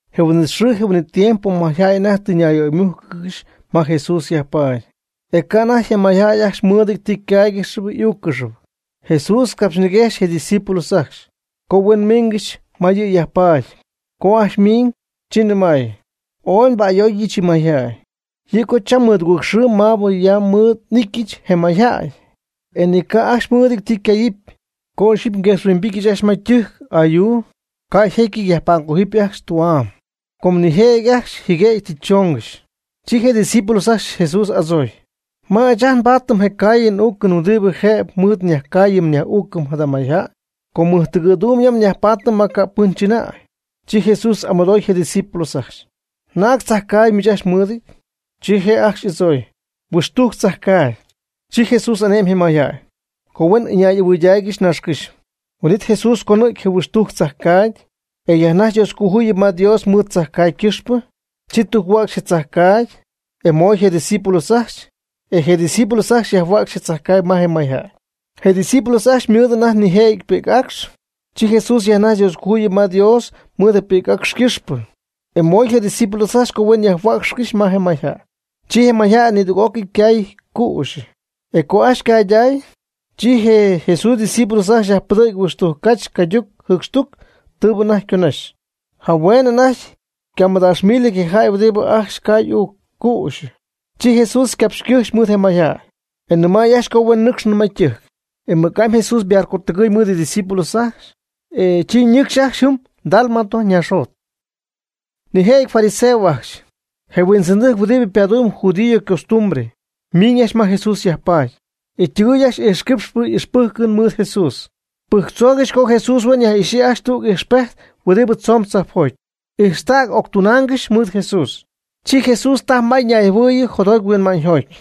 Je huin'it xɨɨ je huin'it tiempo mayjäy anajty tɨ ñaymújcɨgɨxy ma Jesús yajpaady, e ca' anajty je mayjäy ajcxy mɨɨdɨty ti ycáaygɨxɨpy y'úuccɨxɨpy. Jesús capxyñiguejxy je' ydiscípulos ajcxy, co huen miingɨxy ma yɨ' yajpaady. Co ajcxy ymiiñ, chi nɨmay: ―Ooy nba'ayooyɨch yɨ mayjäy. Yɨ' co cham mɨdugɨɨg xɨɨ maabɨ ya mɨɨd y'ityɨch je mayjäy, e ni ca' ajcxy mɨ́ɨdɨty ti ycayɨpy. Co ixyipy nguexhuimbityɨch ajcxy ma ytɨjc ayuu, ca' yjécyɨty yajpa'mgójɨpy ajcxy tü'am, com nijëjɨty ajcxy jɨguëgy tɨ choongɨxy. Chi je discípulos ajcxy Jesús adzooy: ―¿Ma ɨɨch ajt nbaatɨm je caayɨn uucɨn huɨdibɨ jëb mɨɨd nyajcaayɨm nyaj'úucɨm jada mayjäy? Com mɨjtɨgɨ̈duum ya nyajpaatɨm ma ca' pɨn chɨnäy. Chi Jesús y'amɨdooy je' ydiscípulos ajcxy: ―¿Naag tzajcaagy miich ajcxy mɨɨdɨty? Chi je' ajcxy y'adzooy: ―Huɨxtujc tzajcaagy. Chi Jesús ane'my je mayjäy, co huen ɨñay'ahuɨɨygɨxy naaxcɨ́xy. Huin'it Jesús conɨ̈gy je huɨxtujcp tzajcaagy, e yajnajxy Dioscojuyɨp ma Dios mɨɨd tzajcaagy ycɨxpɨ. Chi tujc-huäcxy je tzajcaagy, e moy je' ydiscípulos ajcxy, e je' ydiscípulos ajcxy yajhuäcxy je tzajcaagy ma je mayjäy. Je Jesús ydiscípulos ajcxy ymɨɨd anajty nijëjɨty pi'c acx. Chi Jesús yajnajxy Dioscojuyip ma Dios mɨɨd je pi'c acx ycɨxpɨ, e moy je' ydiscípulos ajcxy huen yajhuäcxtaygɨxy ma je mayjäy. Chi je mayjäy nidüg'ócɨy ycay cüxyɨ, e co ajcxy ycayday, chi je Jesús ydiscípulos ajcxy yajpɨdɨ̈gy huɨxtujc cach cayduc jɨɨcxtuc tɨɨbɨ anajty yconaxy. Jahueenɨ anajty ycamɨdaaxmilɨty je jäy huɨdibɨ ajcxy cay uuc cüxyɨ. Chi Jesús ycapxy ycɨjxy mɨɨd je mayjäy, e nɨmay ajcxy co huen nɨcxcɨxy ma ytɨjc. E mɨc'amy Jesús ybarcotɨgɨy mɨɨd ydiscípulos ajcxy, e chi ñɨcxy ajcxy jɨm Dalmanuta ñaaxjot. Nijëjɨty fariseos ajcxy, je huindzɨndɨjc huɨdibɨ padumb judío ycostumbre, ymiiñ ajcxy ma Jesús yajpaady, e ytɨgɨy ajcxy ijxquípxcɨxy y'ixpɨjcɨn mɨɨd Jesús. Pɨjctzoogɨxy co Jesús huen yaj'ixyii ajcxy tüg ijxpejt huɨdibɨ tzomb tzajpjoty. Ijxta'n octunaangɨxy mɨɨd Jesús. Chi Jesús tajy may ñayjɨhuɨɨyɨ jotjoty huinma'ñyjoty,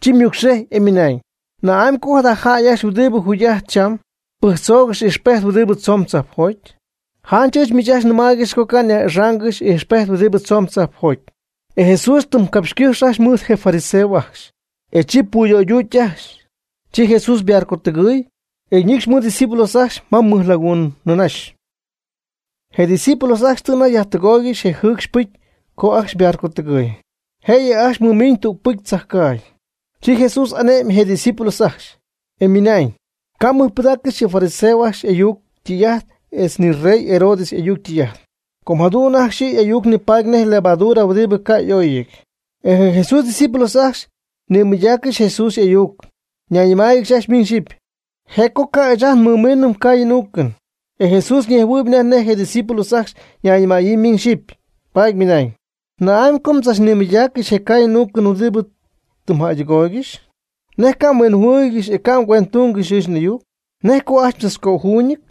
chi ymɨcxejy, e ymɨnañ: ―¿Na'amy co jada jäy ajcxy huɨdibɨ jugy'ajtp cham, pɨjctzoogɨxy ijxpejt huɨdibɨ tzomb tzajpjoty? Janch ɨɨch miich nɨmaaygɨxy co ca' nyaj'ixaangɨxy ijxpejt huɨdibɨ tzomb tzajpjoty. E Jesús ytɨmycapxycɨ́xy mɨɨd je fariseos ajcxy, e chi puyöyduuty ajcxy. Chi Jesús ybarcotɨgɨɨy, e ñɨcxy mɨɨd ydiscípulos ajcxy ma mɨj laguun ñïnaxy. Je' ydiscípulos ajcxy tɨ anajty jaydɨgoygɨxy je jɨɨcxy pɨcy co ajcxy ybarcotɨgɨy. Jëyɨ ajcxy mɨmiiñ tüg pi'c tzajcaagy. Chi Jesús ane'myb je' ydiscípulos ajcxy, e ymɨnañ: ―Ca' mmɨjpɨdaaccɨxy yɨ fariseojäy ajcxy y'ayuc ytɨy'ajt etz ni rey Herodes y'ayuc ytɨy'ajt, com jadu'n ajcxy y'ayuc nipaady nej levadura huɨdibɨ ca' y'óyɨty. E je Jesús ydiscípulos ajcxy nimɨydaaccɨxy Jesús y'ayuc ñayñɨmáayɨgɨxy ajcxy miñ xyɨpy: ―Je' co ca' ɨɨch ajt nmɨmiinɨm caayɨn uucɨn. E Jesús ñejhuɨɨyb anajty nej je' ydiscípulos ajcxy ñayñɨmaayɨ miñ xyɨpy, paady ymɨnañ: ―¿Na'amy co mdzachnimɨydaaccɨxy je caayɨn uucɨn huɨdibɨ tɨ mjäydɨgooygɨxy? ¿Nej ca' mhuinjɨhuɨɨygɨxy e ca' mguendɨtungɨxy ɨɨch n'ayuc? ¿Nej co ajcxy mdzachcöjuuñɨty?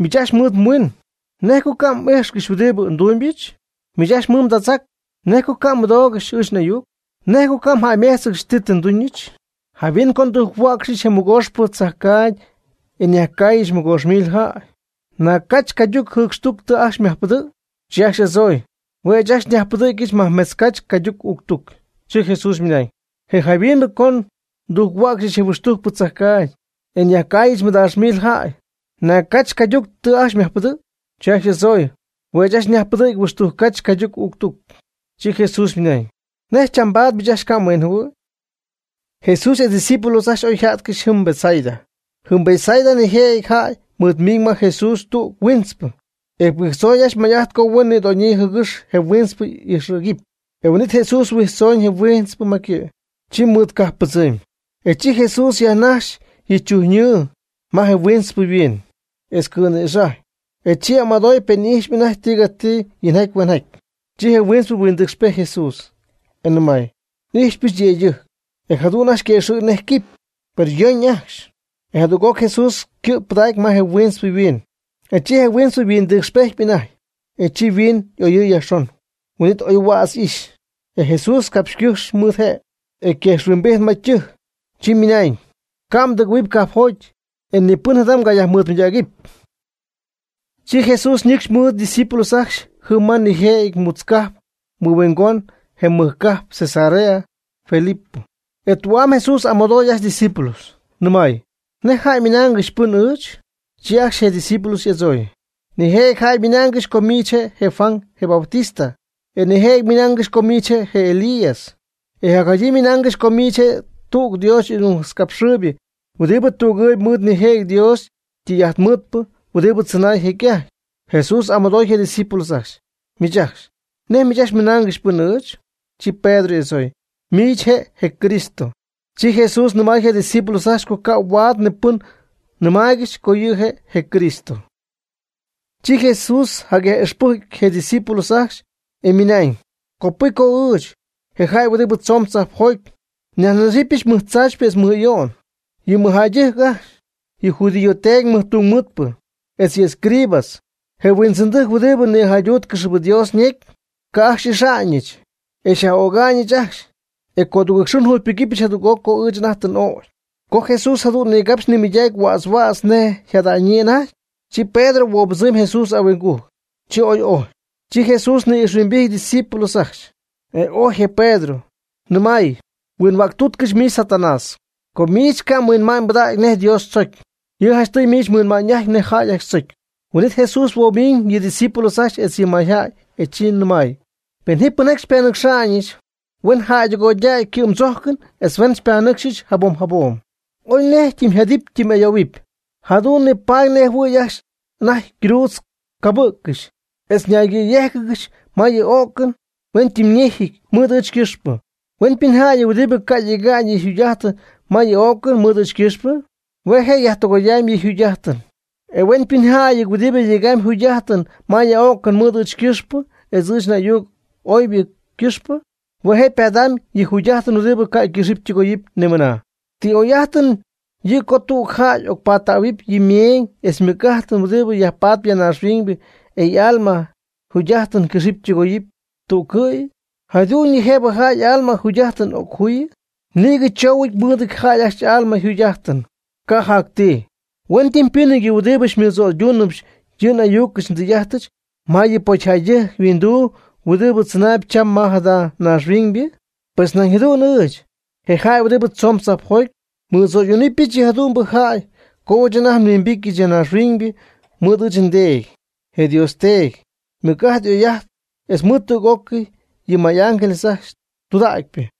Miich ajcxy mɨɨd mhuiin: ¿Nej co ca' m'ijxcɨxy huɨdibɨ ndumybɨch? Miich ajcxy mɨɨd mdädzac: ¿Nej co ca' mmɨdo'mbɨ́jccɨxy ɨɨch n'ayuc? ¿Nej co ca' mjäyméjtzcɨxy ti tɨ nduñɨch? Jayhuin co ndujc-huäcxyɨch je mɨgooxpɨ tzajcaagy e nyajcaayɨch mɨgoox mil jäy: ¿Naag cach cayduc jɨcxtuc tɨ ajcxy myajpɨdɨ̈gy? Chi ajcxy y'adzooy: ―Hue' ɨɨch ajcxy nyajpɨdɨ̈gyɨch majmetz cach cayduc jɨcxtuc. Chi Jesús ymɨnañ: ―E jayhuin co ndujc-huäcxyɨch je huixtujcpɨ tzajcaagy, e nyajcaayɨch mɨdaax mil jäy: ¿Naag cach cayduc tɨ ajcxy myajpɨdɨ̈gy? Chi ajcxy y'adzooy: ―Hue' ɨɨch ajcxy nyajpɨdɨ̈gyɨch huixtujc cach cayduc jɨcxtuc. Chi Jesús ymɨnañ: ―¿Nej chambaad miich ajcxy ca' mhuinjɨhuɨɨy? Jesús etz ydiscípulos ajcxy oy yjá'tcɨxy jɨm Betsaida. Jɨm Betsaida nijëjɨty jäy mɨɨd miiñ ma Jesús tüg huintzpɨ, e pɨjctzoy ajcxy may'ajt co huen nïdoñ jɨgɨx je huintzpɨ y'ijxɨ̈gɨpy. Huin'it Jesús huijtztzooñ je huintzpɨ ma ycɨ', chi mɨɨd cajppɨdzɨmy. E chi Jesús yajjaaxy yɨ chujyñɨɨ je huintzpɨ yhuiin, etz cɨ̈nïxajy, e chi amɨdoy pen y'ijxpy anajty tigati yinjaty huenjaty. Chi je huintzpɨ huindɨcxpejty Jesús, e nɨmay: ―N'ijxypɨch yëydɨjctɨjc, e jadu'n ajcxy yquëxɨ̈gy nej quipy, per yöyp ajcxy. E jadüg'oc Jesús ycɨ' pɨdacy ma je huintzpɨ yhuiin, e chi je huintzpɨ yhuindɨcxpejtpy anajty, e chi yhuiin y'oyɨɨy yajxon, huin'it oy huädz y'ijxy. E Jesús ycapxycɨ́jxy mɨɨd je', e quejxhuimbijty ma ytɨjc. Chi ymɨnañ: ―Ca' mdɨgɨ̈huɨp cajpjoty, e ni pɨn jada mgayajmɨɨdmɨydägɨpy. Chi Jesús ñɨcxy mɨɨd ydiscípulos ajcxy jɨm ma nijëjɨty mutz cajp mɨhuingon je mɨj cajp Cesarea Filipo. E tü'am Jesús amɨdoy ajcxy ydiscípulos, nɨmay: ―¿Nej jäy ymɨnaangɨxy pɨn ɨɨch? Chi ajcxy je' ydiscípulos y'adzooy: ―Nijëjɨty jäy ymɨnaangɨxy co miich je' je Juan, je Bautista. E nijëjɨty ymɨnaangɨxy co miich je' je Elías. E jacjadyii ymɨnaangɨxy co miich je' tüg Dios y'ayucnajtzcapxɨɨybɨ huɨdibɨ tügɨɨyb mɨɨd nijëjɨty Dios ytɨy'ajtmɨɨdpɨ huɨdibɨ tzɨnaay jecy'ajty. Jesús y'amɨdooy je' ydiscípulos ajcxy: ―Miich ajcxy, ¿nej miich mmɨnaangɨxy pɨn ɨɨch? Chi Pedro y'adzooy: ―Miich je' je Cristo. Chi Jesús nɨmay je' ydiscípulos ajcxy co ca' huaad ni pɨn nɨmaaygɨxy, co yɨ' je' je Cristo. Chi Jesús jacyaj'ixpɨjcy je' ydiscípulos ajcxy, e ymɨnañ: ―Copɨcy co ɨɨch, je jäy huɨdi tzoon tzajpjoty, nyajnaxɨpyɨch mɨj tzaachpyɨ etz mɨj ayo'n. Yɨ mɨjjäydɨjc ajcxy, yɨ judío teedy mɨjtungmɨɨdpɨ, etz yɨ escribas, je huindzɨndɨjc huɨdibɨ nïjayduutcɨxyp Dios necy, ca' ajcxy xy'ixa'ñɨch, e xyaj'öga'ñ ajcxy, e codugɨɨg xɨɨ njugypɨgɨpyɨch jadüg'oc co ɨɨch anajty tɨ n'ögy. Co Jesús jadu'n nigapxy nimɨydacy huädz huädz nej yjada'ñyii anajty, chi Pedro huobɨbzɨmy Jesús ahuingujc, chi ooy ojy. Chi Jesús ni'ijxhuimbijty ydiscípulos ajcxy, e ojy je Pedro, ñɨmay: ―Huinhuäctuutcɨch, miich Satanás. Com miich ca' mhuinma'ñ mbɨdägy nej Dios tzocy. Yɨ' janchtɨy miich mhuinma'ñ'ajtpy nej jäy ajcxy tzocy. Huin'it Jesús huoomiñ yɨ' ydiscípulos ajcxy etz yɨ mayjäy, e chi nɨmay: ―Pen ji pɨnjaty xypanɨcxa'ñɨch, huen jäydɨgoydäy ycɨ'mdzójcɨn etz huen xypanɨcxɨch jabom jabom. Oy nej ytɨmyjadɨpy ytɨmy'ayoohuɨpy. Jadu'n nipaady nej jɨhuɨ̈y ajcxy anajty mgruudz mgabɨ̈ccɨxy, etz naygɨ̈yéjcɨgɨxy ma yɨ ó'cɨn huen ytɨmyñéjɨty mɨɨd ɨɨch ycɨxpɨ. Huenpɨnjäy huɨdibɨ ca' yega'ñ yɨ yjugy'ájtɨn ma yɨ ó'cɨn mɨɨd ɨɨch ycɨxpɨ, hue' je' yajtɨgoyamy yɨ'yjugy'ájtɨn. E huenpɨnjäy huɨdibɨ yegamy yjugy'ájtɨn ma yɨ ó'cɨn mɨɨd ɨɨch ycɨxpɨ etz ɨɨch y'ayuc oybɨ ycɨxpɨ, hue' je' ypadamyb yɨ jugy'ájtɨn huɨdibɨ ca' cɨxɨpy tɨgoyɨpy ni mɨnaa. ¿Ti oy'ájtɨn yɨ' co tüg jäy y'ocnayyajpadɨɨyb yɨ meeñ etz mɨc'ájtɨn (huɨdi yajpaatp ya ñaaxhuiñybɨ) e y'alma yjugy'ájtɨn cɨxɨpy tɨgoyɨpy tügcɨ̈y? ¿Jadu'ñyɨ jëb jäy y'alma yjugy'ájtɨn occojuyɨ? Nïgɨ tzoohuɨn mɨɨdɨty jäy ajcxy y'alma yjugy'ájtɨn, ca' jac ti. Huentɨmpɨ́nɨty yɨ huɨdibɨ xymɨdzo'ydúnɨbɨch yɨ n'ayucɨch ndɨy'ájtɨch ma yɨ pocyjäydɨjc yhuinduu huɨdibɨ tzɨnaayb cham ma jada naaxhuiñybɨ. Pues nañ jadu'n ɨɨch, je jäy huɨdibɨ tzoon tzajpjoty, nmɨdzo'ydúnɨbɨch yɨ jadu'mbɨ jäy co ɨɨch anajty nhuimbity ya naaxhuiñybɨ mɨɨd ɨɨch nDeedy, je Dios Teedy, ymɨc'ajt y'oy'ajt etz mɨɨd tüg'ócɨy yɨ may'ángeles ajcxy tudägypɨ.